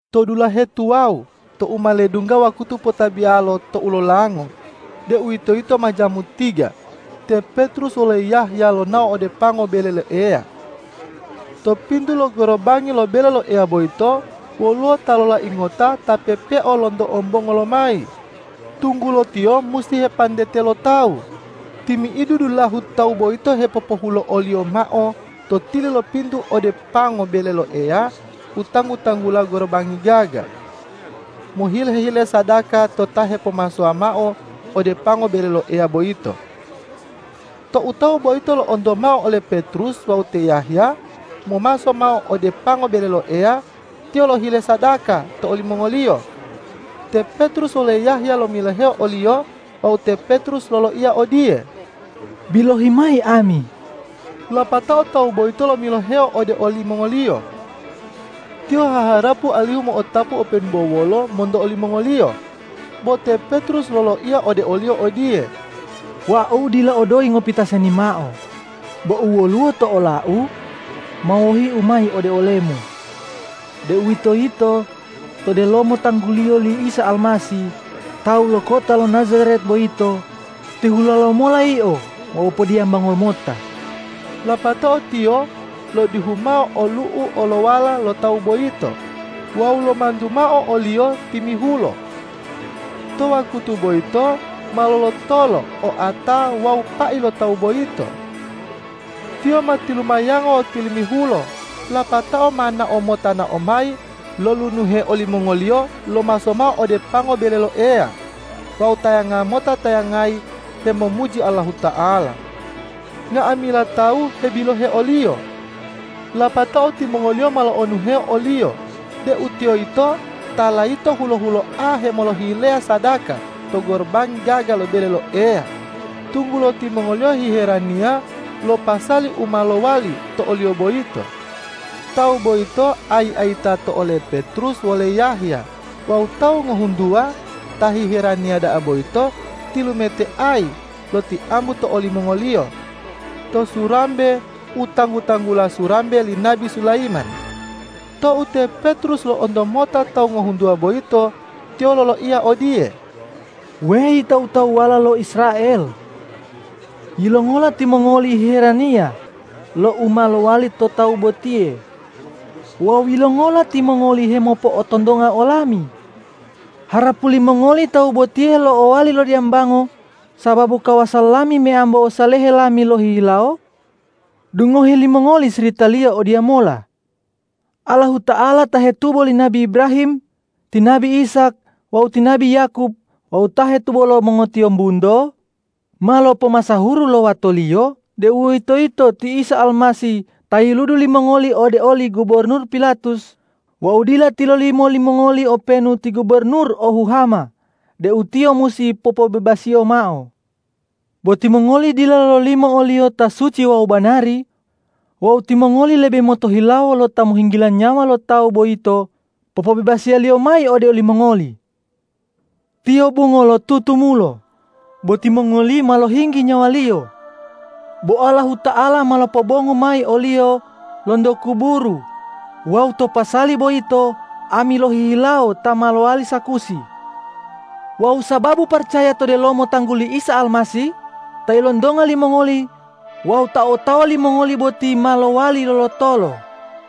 To dulahe tuwawu tou ma ledungga wakutu potabiyalo tou lolango, deuwitoyito ma jamu tiga, te Petrus wole Yahya lonao ode pango bele lo Eya. To pintu lo gorobangi lo bele lo Eya boyito woluwo ta lolai ngota ta pepeo lonto ombongo lomayi, tunggulo tiyo musi hepantete lo tawu. Timi'idu dulahu tawu boyito hepopohulo'oliyo mao to tili lo pintu ode pango bele lo Eya u tanggu-tanggula Gorobangi Gaga, mohile-hile sadaka to ta hepomasowa mao ode pango bele lo Eya boyito. Tou tawu boyito lo'onto mao ole Petrus wawu te Yahya momaso mao ode pango bele lo Eya, tiyo lohile sadaka to olimongoliyo. Te Petrus wole Yahya lomiloheo oliyo wawu te Petrus loloiya odiye,”Bilohi mayi ami.” Lapatao tawu boyito lomiloheo ode olimongoliyo. Tiyo haharapu alihu mo'otapu openu bo wolo monto olimongoliyo. Bo te Petrus loloiya ode oliyo odiye,”Wau dila o doyi ngopita seni mao, bo u woluwo to olau, ma wohiu mayi ode olemu, deuwitoyito to delomo tangguliyo li Isa Almasih tawu lo kota lo Najaret boyito, tihulo lomola yio wawu podiyambango lomota.” Lapatao tiyo lodihu mao olu'u olowala lo tawu boyito wawu lomantu mao oliyo timihulo. To wakutu boyito ma lolotolo oata wawu pai lo tawu boyito. Tiyo ma tilumayango wawu tilimihulo lapatao ma nao mota nao mayi lolunuhe olimongoliyo lomaso mao ode pango bele lo Eya wawu tayanga mota tayangayi hemomuji Allahuta'ala. Nga'amila tawu hebilohe oliyo. Lapatao timongoliyo ma lo'onuhe oliyo deu tiyo yito ta layito hulo-huloa hemolohileya sadaka to Gorobangi Gaga lo bele lo Eya, tunggulo timongoliyo hiheraniya lo pasali u ma lowali to oliyo boyito. Tawu boyito ayi-ayita to ole Petrus wole Yahya wawu tawu ngohuntuwa ta hiheraniya da'a boyito tilumeteayi lotiambu to olimongoliyo to surambe u tanggu-tanggula Surambe li Nabi Sulayiman. Tou te Petrus lo'onto mota tawu ngohuntuwa boyito, tiyo loloiya odiye,”Weyi tawu-tawuwala lo Israel! Yilongola timongoli hiheraniya lo u ma lowali to tawu botiye wawu yilongola timongoli hemopo'otontonga olami, harapu limongoli tawu botiye lo'owali lodiyambango sababu kawasa lami meyambo ossalehe lami lohihilawo? Dungohi limongoli siritaliyo odiyamola: Allahuta'ala ta hetubo li nabi Ibrahim, ti nabi Ishak wawu ti nabi Yakob wawu ta hetubo lo mongotiyombunto, ma lopomasahuru lo Wato-Liyo, deuwitoyito ti Isa Almasih ta yiludu limongoli ode oli gubornur Pilatus wawu dila tilolimo limongoli openu ti gubornur o huhama deu Tiyo musi popobebasiyo mao. Bo timongoli dila lololimo o-Liyo ta suci wawu banari wawu timongoli lebe motohilawo lo ta mohinggila nyawa lo tawu boyito popobebasiyoliyo mayi ode olimongoli. Tiyo bungo lo tutumulo, bo timongoli ma lohinggi nyawa-Liyo. Bo Allahuta'ala ma lopobongu mayi o-Liyo lonto kuburu wawu to pasali boyito ami lohihilawo ta ma lowali sakusi. Wawu sababu paracaya to delomo tangguli Isa Almasih, ta ilontonga limongoli wawu ta otawa limongoli boti ma lowali lolotolo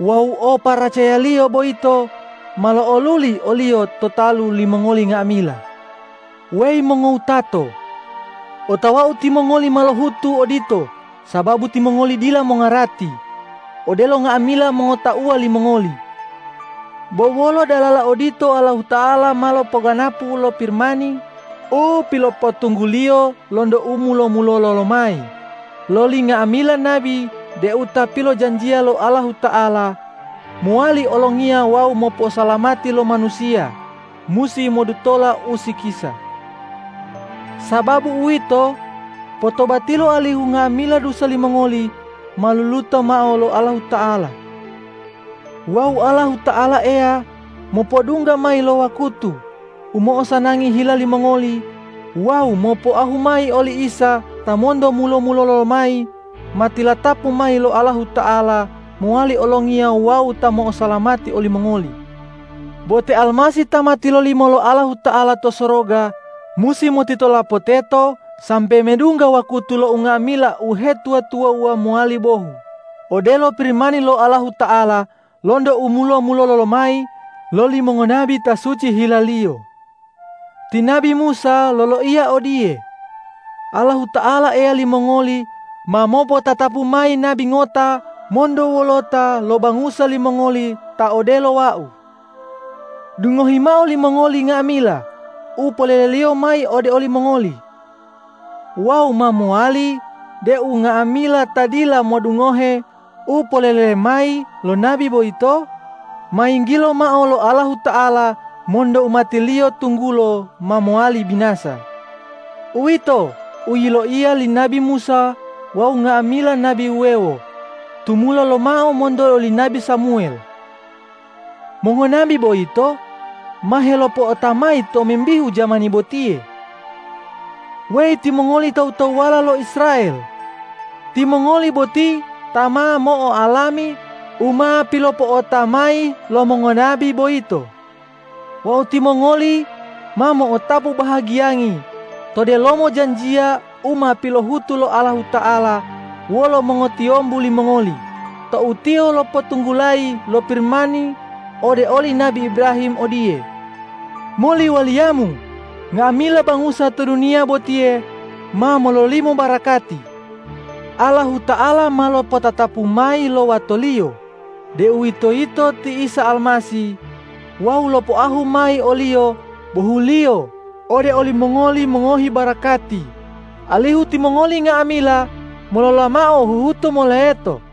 wawu o paracayaliyo boyito ma lo'oluli oliyo to talu limongoli nga'amila. Weyi mongowutato, otawau timongoli ma lohutu odito sababu timongoli dila mongarati, odelo nga'amila mongotauwa limongoli. Bo wolo dalala odito Allahuta'ala ma lopoganapu lo Pirimani u pilopotunggu-Liyo lonto u mulo-mulolo lomayi loli nga'amila nabi deu Ta pilojanjiya lo Allahuta'ala mowali Olongiya wawu moposalamati lo manusiya, musi modutola usikisa. Sababu utiwo, potobatilo alihu nga'amila dusa limongoli ma luluto mao lo Allahuta'ala wawu Allahuta'ala Eya mopodungga mayi lo wakutu u mo'osanangi hila limongoli wawu mopoahu mayi oli Isa ta monto mulo-mulolo lomayi ma tilatapu mayi lo Allahuta'ala mowali Olongiya wawu Ta mo'osalamati olimongoli. Bo te Almasih ta ma tilolimo lo Allahuta'ala to soroga musi motitolapo teto sambe medungga wakutu lo unga'amila uhetuwa-tuwawuwa mowali bohu, odelo Pirimani lo Allahuta'ala lonto u mulo-mulolo lomayi loli mongonabi ta suci hilaliyo. Ti nabi Musa loloiya odiye, ’Allahuta'ala Eya limongoli ma mopotatapu mayi nabi ngota monto wolota lo bangusa limongoli ta odelo wau. Dungohi mao limongoli nga'amila u poleleliyo mayi ode olimongoli. Wawu ma mowali deu nga'amila ta dila modungohe u polele mayi lo nabi boyito, ma yinggilo mao lo Allahuta'ala monto umati-Liyo tunggulo ma mowali binasa.’ Uwito u yiloiya li nabi Musa wawu nga'amila nabi wuwewo tumula lomao monto oli nabi Samuwel. Mongonabi boyito ma helopo'ota mayi tomimbihu jamani botiye. Weyi timongoli tawu-tawuwala lo Israel, timongoli boti ta ma mo'oalami u ma pilopo'ota mayi lo mongonabi boyito. Wawu timongoli ma mo'otapu bahagiyangi to delomo janjiya u ma pilohutu lo Allahuta'ala wolo mongotiyombu limongoli tou Tiyo lopotunggulayi lo Pirimani ode oli nabi Ibrahim odiye,”Moli waliyamu nga'amila bangusa to duniya botiye ma mololimo barakati.” Allahuta'ala ma lopotatapu mayi lo Wato-Liyo, deuwitoyito ti Isa Almasih, wawu lopoahu mayi o-Liyo bohuliyo ode olimongoli mongohi barakati, alihu timongoli nga'amila molola mao huhutu moleto.”